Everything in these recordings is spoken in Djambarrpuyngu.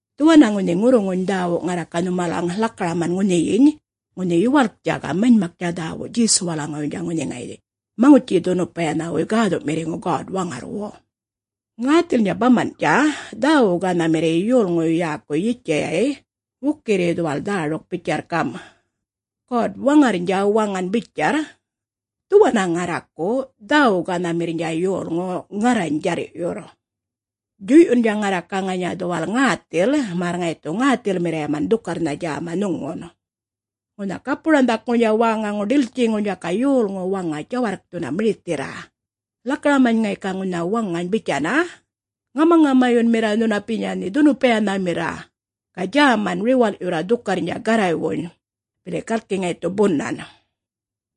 Dhuwanna ŋunhi ŋurruŋuny dhäwu ŋarra ga nhumalaŋgal lakaraman ŋunhiyiny, ŋunhi yuwalktja ga manymaktja dhäwu Djesuwalaŋuwuynydja, ŋunhi ŋayiny Maŋutji-dhunupayanhawuy Gäthu'mirriŋu God-Waŋarrwu. Ŋäthilnydja baman'tja dhäwu-gänhamirriy yolŋuy yäkuy Yitjayay wukirri dhuwal dhäruk bitjarr gam', “God-Waŋarrnydja waŋan bitjarr, ‘Dhuwanna ŋarraku dhäwu-gänhamirrnydja yolŋu, ŋarrany djarr'yurr. Djuy'yundja ŋarra ga ŋanya dhuwal ŋäthil, märr ŋayi dhu ŋäthilmirriyaman dhukarrnha djäma nhuŋun.’ Ŋunha gapu-ranhdhakŋurnydja wäŋaŋur ḏiltjiŋurnydja ga yolŋu waŋa djawarrkthunna mirithirra, lakaramany ŋayi ga ŋunha waŋany bitjanna: ‘Ŋamaŋamayunmirra nhunapinya nhe dhunupayanhamirra, ga djäman riwal'yurra dhukarrnydja Garraywuny, bili galki ŋayi dhu bunan,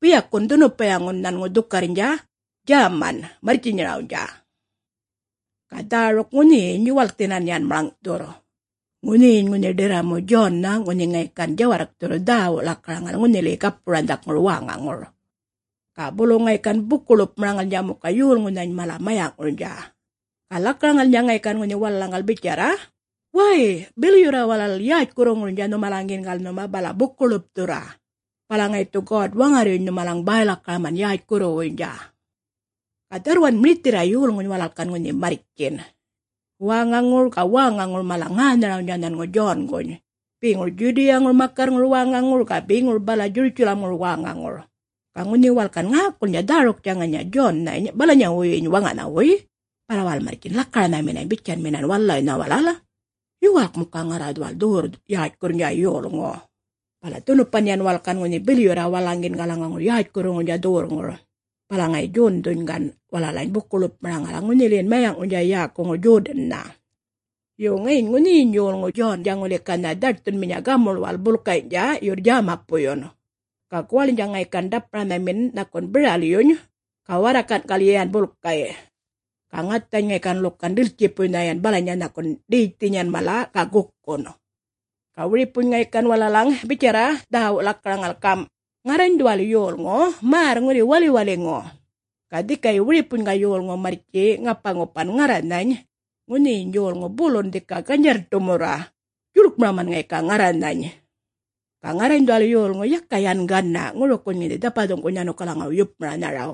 biyakun dhunupayaŋun nhanŋu dhukarrnydja djäma marrtjinyarawnydja.’” Ga dhäruk ŋunhiyiny yuwalkthinan yan maḻŋ'thurr. Ŋunhiyiny ŋunhi ḏirramu Djonnha, ŋunhi ŋayi gan djawarrkthurr dhäwu lakaraŋal ŋunhiliyi gapu-ranhdhakŋur wäŋaŋur, ga bulu ŋayi gan buku-lupmaraŋalnydja muka yolŋunhany mala mayaŋurnydja. Ga lakaraŋalnydja ŋayi gan ŋunhi walalaŋgal bitjarra, “Way bilyurra walal yätjkurruŋurnydja nhumalaŋgiyingal nhuma, bala buku-ḻupthurra, bala ŋayi dhu God-Waŋarryuny nhumalaŋ bäy-lakaraman yätjkurruwuynydja.” Ga dharrwan mirithirra yolŋuny walal gan ŋunhi marrtjin, wäŋaŋur ga wäŋaŋur mala ŋänharawnydja nhanŋu Djonguny, beŋur Djudiyaŋur makarrŋur wäŋaŋur, ga beŋur bala Djurutjalamŋur wäŋaŋur. Ga ŋunhi walal gan ŋäkulnydja dhäruktja ŋanya Djonnhany balanyawuyyiny waŋanhawuy, bala walal marrtjin lakaranhaminany bitjanminan walalawuynhany walal, “Yuwalk muka yan ŋarra dhuwal dhuwurr-yätjkurrnydja yolŋu.” Bala dhunupan yan walal gan ŋunhi bilyurra walalaŋgiyingalaŋaŋur yätjkurruŋurnydja dhuwurrŋur, bala ŋayi Djondhuny gan walalany buku-ḻupmaraŋala ŋunhiliyin mayaŋurnydja yäkuŋur Djodannha. Yo, ŋayiny ŋunhiyiny yolŋu Djondja ŋuli ganha dhaṯthunminya gamuḻwal bulkayny'tja yurr djämapuyyun. Ga guwaḻnydja ŋayi gan ḏapmaranhamin nhakun biralyuny ga warrakan'kalyi yan bulkay'; ga ŋathany ŋayi gan ḻukan ḏiltjipuynha yan balanya nhakun ḏetjthinyan mala, ga gukun. Ga wiripuny ŋayi gan walalaŋ bitjarra dhäwu lakaraŋal gam', “Ŋarrany dhuwal yolŋu märr ŋuli waliwaliŋu, ga dhikayi wiripuny ga yolŋu marrtji ŋapa-ŋupan ŋarranhany ŋunhiyiny yolŋu bulun dhika ganydjarr-ḏumurra djuḻkmaraman ŋayi ga ŋarranhany. Ga ŋarrany dhuwal yolŋu yaka yan gana' ŋurukuny ŋunhi dhapathuŋ'kuny nhanukalaŋuw yupmaranharaw.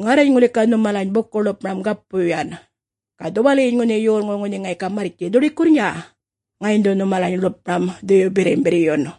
Ŋarrany ŋuli ga nhumalany buku-ḻupmaram gapuy yan, ga dhuwaliyiny ŋunhi yolŋu ŋunhi ŋayi ga marrtji dhuḏikurrnydja, ŋayiny dhu nhumalany ḻupmaram Dhuyu Birrimbirryun.”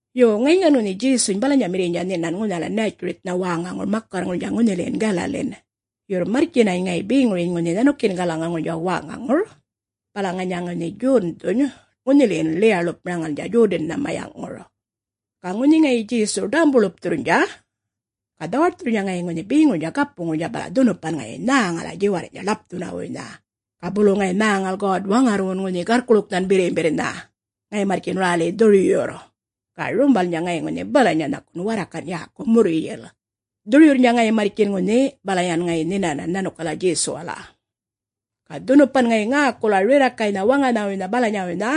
Yo ŋayiny gan ŋunhi Djesuny balanyamirriynydja nhinan ŋunhala Nätjuritjnha wäŋaŋur, makarrŋurnydja ŋunhiliyin Galalin, yurr marrtjinany ŋayi beŋuryiny ŋunhi nhanukiyingalaŋuŋurnydja wäŋaŋur, bala ŋanya ŋayi ŋunhi Djondhuny ŋunhiliyin ḻiya-ḻupmaraŋalnydja Djodannha mayaŋŋur. Ga ŋunhi ŋayi Djesu ḏämbu-ḻupthurrnydja, ga dhawaṯthurr ŋayi ŋunhi beŋurnydja gapuŋurnydja, bala dhunupan ŋayi nhäŋala djiwarrny'tja ḻapthunawuynha, ga bulu ŋayi nhäŋal God-Waŋarrwun Garrkuḻuknhan Birrimbirrnha, ŋayi marrtjin räli dhuryurr, ga rumbalnydja ŋayi ŋunhi balanya nhakun warrakan' yäku murryil, dhuryurrnydja ŋayi marrtjin ŋunhi, bala yan ŋayi nhinanan nhanukal Djesuwala. Ga dhunupan ŋayi ŋäkula rirrakaynha waŋanhawuynha balanyawuynha,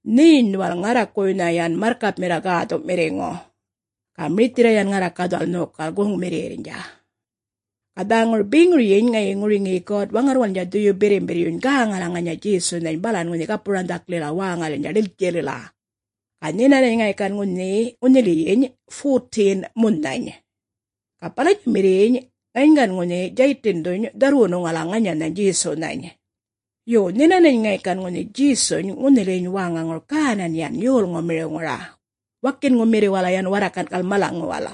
“Nheny dhuwal ŋarrakuwuynha yan marrkapmirra Gäthu'mirriŋu, ga mirithirra yan ŋarra ga dhuwal nhokal goŋmirriyirrnydja.” Ga dhäŋur beŋuryiny ŋayi ŋuruŋiyi God-Waŋarrwalnydja Dhuyuy Birrimbirryuny gäŋala ŋanya Djesunhany balan ŋunhi gapu-ranhdhaklila wäŋalilnydja ḏiltjilila, ga nhinanany ŋayi gan ŋunhiliyiny 40-n munhany. Ga balanyamirriyyiny ŋayiny gan ŋunhi Djaytindhuny dharrwunuŋala ŋanyanhany Djesunhany. Yo, nhinanany ŋayi gan ŋunhi Djesuny ŋunhiliyiny wäŋaŋur gänan yan yolŋumiriwŋura, wakinŋumirriwala yan warrakan'kal malaŋuwal.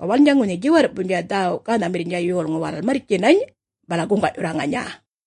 Ga walalnydja ŋunhi djiwarr'puynydja dhäwu-gänhamirrnydja yolŋu walal marrtjinany bala guŋga'yurra ŋanya.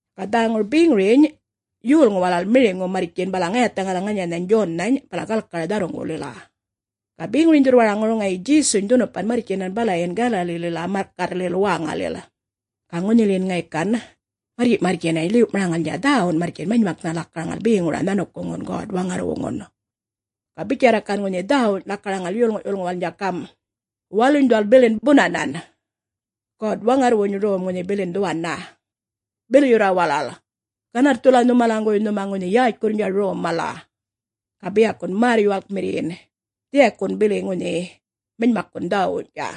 Ga dhäŋur beŋuryiny yolŋu walal miriŋu marrtjin bala ŋayathaŋala ŋanyanhany Djonnhany, bala galkara dharruŋgulila. Ga beŋuryiny dhurrwaraŋur ŋayi Djesuny dhunupan marrtjinan balayin Galalilila makarrlil wäŋalil, ga ŋunhiliyin ŋayi gan marrtji'-marrtjinany ḻiw'maraŋalnydja, dhäwun marrtjin manymaknha lakaraŋal beŋura nhanukuŋun God-Waŋarrwuŋun. Ga bitjarra ŋayi gan ŋunhi dhäwuny lakaraŋal yolŋu'-yulŋuwalnydja gam', “Waluny dhuwal bilin bunanan. God-Waŋarrwuny Rom ŋunhi bilin dhuwanna. Bilyurra walal. Ganarrthula nhumalaŋguwuy nhuma ŋunhi yätjkurrnydja rom mala, ga biyakun märr-yuwalkmirriyin dhiyakun bili yan manymakkun dhäwuwny'tja.”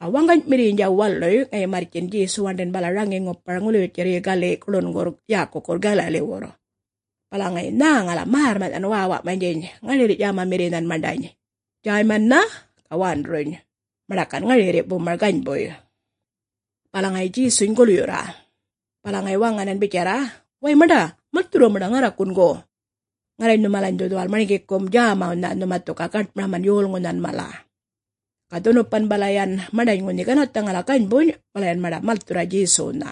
Ga waŋganymirrnydja waluy ŋayi marrtjin Djesu waṉḏin bala raŋi-ŋupar ŋuliwitjarryi gali' guḻun'kurr yäkukurr Galaliwurr, bala ŋayi nhäŋala märrma'nhan wäwa'manydjiny ŋarirri'-djämamirrinhan maṉḏany, Djäymannha, ga Wanduruny, maṉḏa gan ŋarirri bumar ganybuy. Bala ŋayi Djesuny gulyurra, bala ŋayi waŋanan bitjarra, “Way maṉḏa, malthurra maṉḏa ŋarrakun go. Ŋarrany nhumalany dhu dhuwal marŋgikum djämawnha, nhuma dhu ga gaṯmaraman yolŋunhan mala.” Ga dhunupan bala yan maṉḏany ŋunhi ganarrthaŋala ganybuny, bala yan maṉḏa malthurra Djesuwnha.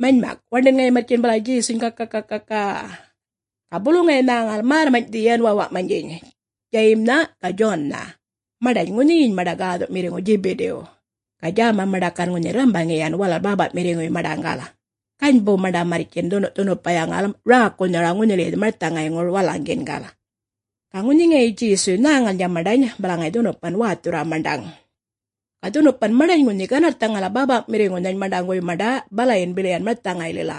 Manymak waṉḏin ŋayi marrtjin bala Djesuny ga-ga-ga-ga-a-a-a, ga bulu ŋayi nhäŋal märrmany'thi yan wäwa'manydjiny, Djayimnha ga Djonnha, maṉḏany ŋunhiyiny maṉḏa gäthu'mirriŋu Djibidiw, ga djäma maṉḏa gan ŋunhi rrambaŋi yan walal bäpa'mirriŋuy maṉḏaŋgal, ganybu maṉḏa marrtjin dhunu'-dhunupayaŋal räkunharawnha ŋunhiliyi marthaŋayŋur walalaŋgiyingal. Ga ŋunhi ŋayi Djesuy nhäŋalnydja maṉḏany, bala ŋayi dhunupan wäthurra maṉḏaŋ. Ga dhunupan maṉḏany ŋunhi ganarrthaŋala bäpa'mirriŋunhany maṉḏaŋguwuy maṉḏa balayin bili yan marthaŋaylila,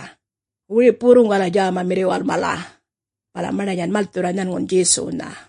wiripuwurruŋgala djämamirriwal mala. Bala maṉḏany yan malthurra nhanŋun Djesuwnha.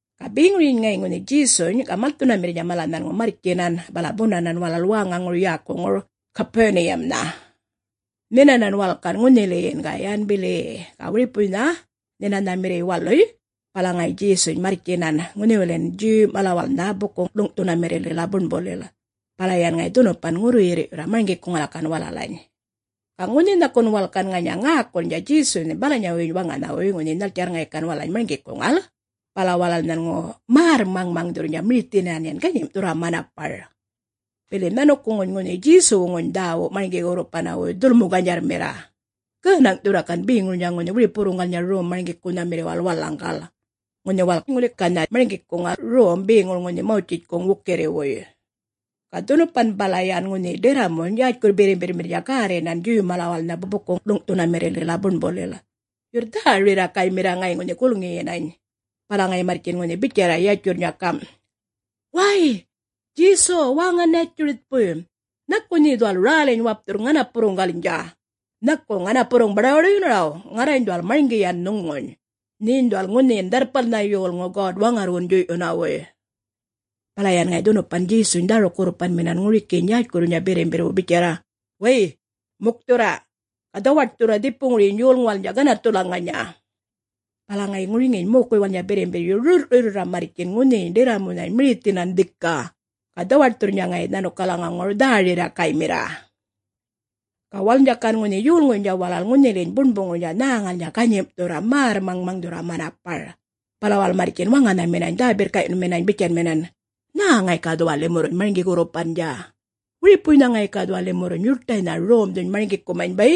Ga beŋuryiny ŋayi ŋunhi Djesuny ga malthunamirrnydja mala nhanŋu marrtjinan, bala bunanan walal wäŋaŋur yäkuŋur Gapuniyamnha. Nhinanan walal gan ŋunhiliyin, ga yan bili-i-i; ga wiripuŋuynha Nhinanhamirriy waluy, bala ŋayi Djesuny marrtjinan ŋunhiwilin Djuw malawalnha buku-ḻuŋ'maranhamirrilila buṉbulil, bala yan ŋayi dhunupan ŋurruyirr'yurra marŋgikuŋala gan walalany. Ga ŋunhi nhakun walal gan ŋanya ŋäkulnydja Djesunhany balanyawuyyiny waŋanhawuy ŋunhi nhaltjarr ŋayi gan walalany marŋgikuŋal, bala walal nhanŋu märr-maŋmaŋdhurrnydja mirithinan yan, ganyim'thurra manapar. Bili nhanukuŋuny ŋunhi Djesuwuŋuny dhäwu marŋgi-wurrupanawuy dhulmu-ganydjarrmirra, gänaŋ'thurra gan beŋurnydja ŋunhi wiripuwurruŋgalnydja rom-marŋgikunhamirriwal walalaŋgal, ŋunhi walal ŋuli ganha marŋgikunha rom beŋur ŋunhi Mawtjitjkuŋ wukirriwuy. Ga dhunupan bala yan ŋunhi ḏirramuny yätjkurr-birrimbirrmirrnydja gärrinan Djuw malawalnha buku-ḻuŋ'maranhamirrilila buṉbulil, yurr dhä-rirrakaymirra ŋayi ŋunhi gulŋiyinany; bala ŋayi marrtjin ŋunhi bitjarra yatjurrnydja gam', “Way, Djesu wäŋa-Nätjuritjpuy! Nhaku nhe dhuwal räliny wapthurr ŋanapurruŋgalnydja? Nhaku ŋanapurruŋ baḏuwaḏuyunaraw? Ŋarrany dhuwal marŋgi yan nhuŋuny. Nheny dhuwal ŋunhiyin, Dharrpalnha Yolŋu, God-Waŋarrwuŋun djuy'yunawuy.” Bala yan ŋayi dhunupan Djesuny dhäruk-gurrupanminan ŋurikiyiny yätjkurruwnydja birrimbirrwu bitjarra, “Way, mukthurra! Ga dhawaṯthurra, dhipuŋuryiny yolŋuwalnydja ganarrthula ŋanya!” Bala ŋayi ŋuriŋiyiny mokuywalnydja birrimbirryu rurr'rurryurra marrtjin ŋunhiyiny ḏirramunhany mirithinan dhika, ga dhawaṯthurrnydja ŋayi nhanukalaŋaŋur dhä-rirrakaymirra. Ga walalnydja gan ŋunhi yolŋuynydja walal ŋunhiliyiny buṉbuŋurnydja nhäŋalnydja ganyim'thurra, märr-maŋmaŋdhurra manapar. Bala walal marrtjin waŋanhaminany dhä-birrka'yunminany bitjanminan, “Nhä ŋayi ga dhuwal limurruny marŋgi-gurrupandja? Wiripuynha ŋayi ga dhuwal limurruny yuṯaynha romdhuny marŋgikumany bay!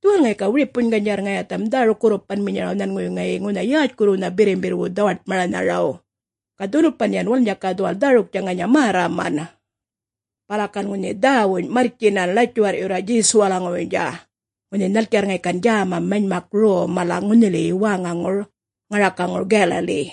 Dhuwal ŋayi ga wiripuny ganydjarr ŋayatham dhäruk-gurrupanminyaraw nhanŋuwuy ŋayi ŋunha yätjkurruwnha birrimbirrwu dhawaṯmaranharaw, ga dhunupan yan walalnydja ga dhuwal dhäruktja ŋanya märraman.” Bala gan ŋunhi dhäwuny marrtjinan ḻatjuwarr'yurra Djesuwalaŋuwuynydja, ŋunhi nhaltjarr ŋayi gan djäma manymak rom mala ŋunhiliyi wäŋaŋur ŋarakaŋur Galali.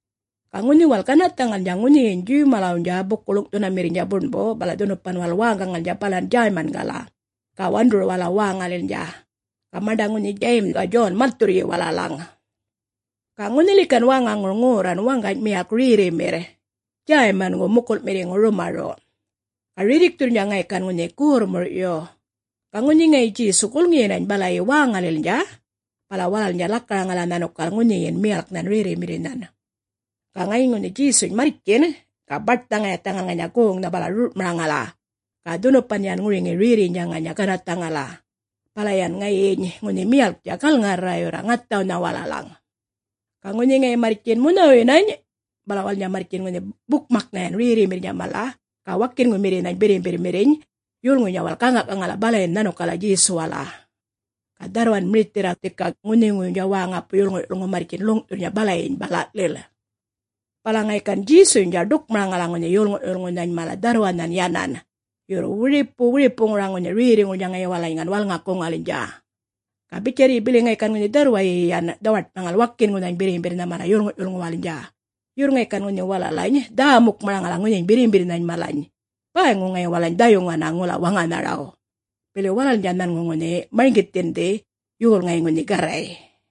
Ga ŋunhi walal ganarrthaŋalnydja ŋunhiyiny Djuw-malawnydja buku-ḻuŋ'maranhamirrnydja buṉbu, bala dhunupan walal wäŋgaŋalnydja balan Djäymangala ga Wanduruwala wäŋalilnydja, ga maṉḏa ŋunhi Djayim ga Djon malthurryi walalaŋ. Ga ŋunhiliyi gan wäŋaŋur ŋorran waŋgany miyalk rerrimirr, Djäymangu mukul'mirriŋu rumaru', ga rirrikthurrnydja ŋayi gan ŋunhi gorrmur'yu. Ga ŋunhi ŋayi Djesu gulŋiyinany balayi wäŋalilnydja, bala walalnydja lakaraŋala nhanukal ŋunhiyin miyalknhan rerrimirrinhan. Ga ŋayiny ŋunhi Djesuny marrtjin, ga baṯnha ŋayathaŋal ŋanya goŋnha, bala rur'maraŋala, ga dhunupan yan ŋuruŋiyi rerriynydja ŋanya ganarrthaŋala, bala yan ŋayiny ŋunhi miyalktja galŋarrarrayurra ŋathawnha walalaŋ. Ga ŋunhi ŋayi marrtjin munhawuyinany, bala walalnydja marrtjin ŋunhi bukmaknhan yan rerrimirrinhany mala ga wakinŋumirrinhany birrimbirrmirriny yolŋuny walalany gäŋa'-gaŋal balayin nhanukala Djesuwala. Ga dharrwan mirithirra dhika ŋunhiŋuwuynydja wäŋawuy yolŋu'-yulŋu marrtjin ḻuŋ'thurra balayiny bala'lil. Bala ŋayi gan Djesuynydja ḏukmaraŋala ŋunhi yolŋu'-yulŋunhany mala dharrwanhan yanan, yurr wiripu wiripuŋura ŋunhi rerriŋurnydja ŋayi walalany gan walŋakuŋalnydja. Ga bitjarryi bili ŋayi gan dharrwayi yan dhawaṯmaraŋal wakinŋunhany birrimbirrnha mala yolŋu'-yulŋuwalnydja, yurr ŋayi gan walalany ŋunhi dhä-mukmaraŋala ŋunhiyiny birrimbirrnhany mala, bäyŋu ŋayi walalany dhayuŋana ŋula waŋanharaw, bili walalnydja nhanŋu ŋunhi marŋgithindhi yol ŋayi ŋunhi Garray.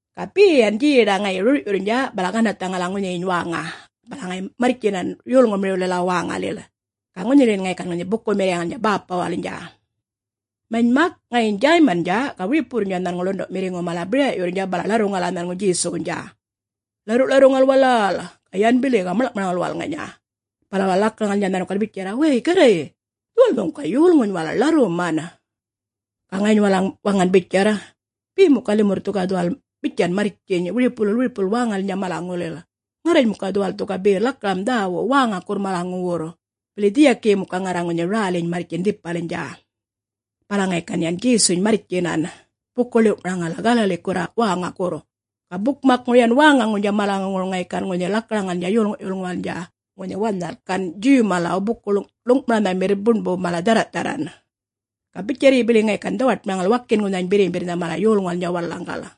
Ga be yan djeḏa ŋayi rur'yurrnydja, bala ganarrthaŋala ŋunhiyiny wäŋa, bala ŋayi marrtjinan yolŋumiriwlila wäŋalil, ga ŋunhiliyin ŋayi gan bukumirriyaŋalnydja Bäpawalnydja. Manymak ŋayiny Djäymandja ga wiripuwurrnydja nhanŋu ḻundu'mirriŋu mala bira'yurrnydja bala ḻarruŋala nhanŋu Djesuwnydja. Ḻarru'-ḻarruŋal wala-a-al, yan bili ga maḻŋ'maraŋal walal ŋanya, bala walal lakaraŋalnydja nhanukal bitjarra, “Way Garray, dhuwal nhuŋu ga yolŋuny walal ḻarruman.” Ga ŋayiny walalaŋ waŋan bitjarr, “Be muka limurr dhu ga dhuwal bitjan marrtjiny, wiripulil, wiripulil wäŋalilnydja malaŋulil. Ŋarrany muka dhuwal dhu ga be lakaram dhäwu wäŋakurr malaŋuwurr, bili dhiyakiyi muka ŋarra ŋunhi räliny marrtjin dhipalnydja.” Bala ŋayi gan yan Djesuny marrtjinan, buku-ḻiw'maraŋala Galalikurra wäŋakurr, ga bukmakŋur yan wäŋaŋurnydja malaŋuŋur ŋayi gan ŋunhi lakaraŋalnydja yolŋu'-yulŋuwalnydja ŋunhi wanhal gan Djuw-malaw buku-ḻuŋ'maranhamirr buṉbu mala dhärra'-dharran. Ga bitjarryi bili ŋayi gan dhawaṯmaraŋal wakinŋunhany birrimbirrnha mala yolŋuwalnydja walalaŋgal.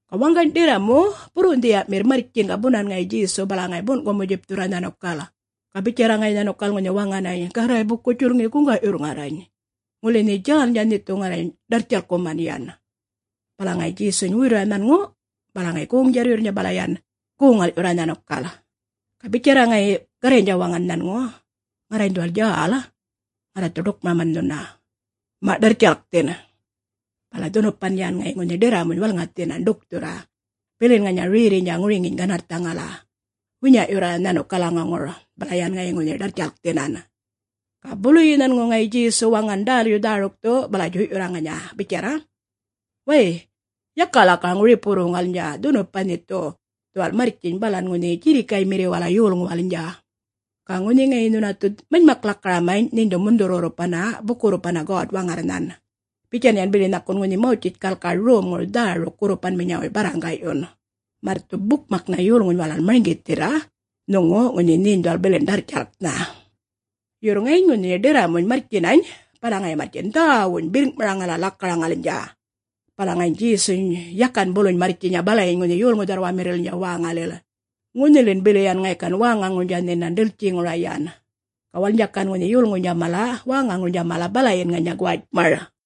Ga waŋgany ḏirramu burrunhdhiya'mirr marrtjin ga bunan ŋayi Djesuw, bala ŋayi bun'kumu-djipthurra nhanukal, ga bitjarra ŋayi nhanukal ŋunhi waŋanany, “Garray buku-djulŋi guŋga'yurr ŋarrany. Ŋuli nhe djälnydja, nhe dhu ŋarrany ḏarrtjalkkuman yan.” Bala ŋayi Djesuny wuyurra nhanŋu, bala ŋayi goŋ-djarryurrnydja bala yan goŋ-ŋal'yurra nhanukal, ga bitjarra ŋayi Garray waŋanany nhanŋu, “Ŋarrany dhuwal djäl ŋarra dhu ḏukmaraman nhuna. Ma', ḏarrtjalkthin.” Bala dhunupan yan ŋayi ŋunhi ḏirramuny walŋathinan, ḏukthurra, bilin ŋanya rerriynydja ŋuruŋiyiny ganarrthaŋala, winya'yurra nhanukalaŋaŋur, bala yan ŋayi ŋunhi ḏarrtjalkthinan. Ga buluyi nhanŋu ŋayi Djesu waŋan ḏälyu dhärukthu, bala djuy'yurra ŋanya bitjarra, “Way, yaka lakaraŋ wiripuwurruŋgalnydja! Dhunupan nhe dhu dhuwal marrtjiny balan ŋunhi djirrikaymirriwala yolŋuwalnydja. Ga ŋunhi ŋayi nhuna dhu manymak-lakaramany, nheny dhu mundhurrnha gurrupan buku-gurrpanna God-Waŋarrnhan, bitjan yan bili nhakun ŋunhi Mawtjitjkal ga romŋur dhäruk-gurrupanminyawuy barraŋga'yun, märr dhu bukmaknha yolŋuny walal marŋgithirr nhuŋu, ŋunhi nheny dhuwali bilin ḏarrtjalknha.” Yurr ŋayiny ŋunhi ḏirramuny marrtjinany, bala ŋayi marrtjin dhäwuny birrŋ'maraŋala lakaraŋalnydja. Bala ŋayiny Djesuny yakan buluny marrtjinya balayiny ŋunhi yolŋu dharrwamirrililnydja wäŋalil, ŋunhilin bili yan ŋayi gan wäŋaŋurnydja nhinan ḏiltjiŋura yan, ga walalnydja gan ŋunhi yolŋuynydja mala wäŋaŋurnydja mala balayin ŋanya guwatjmar.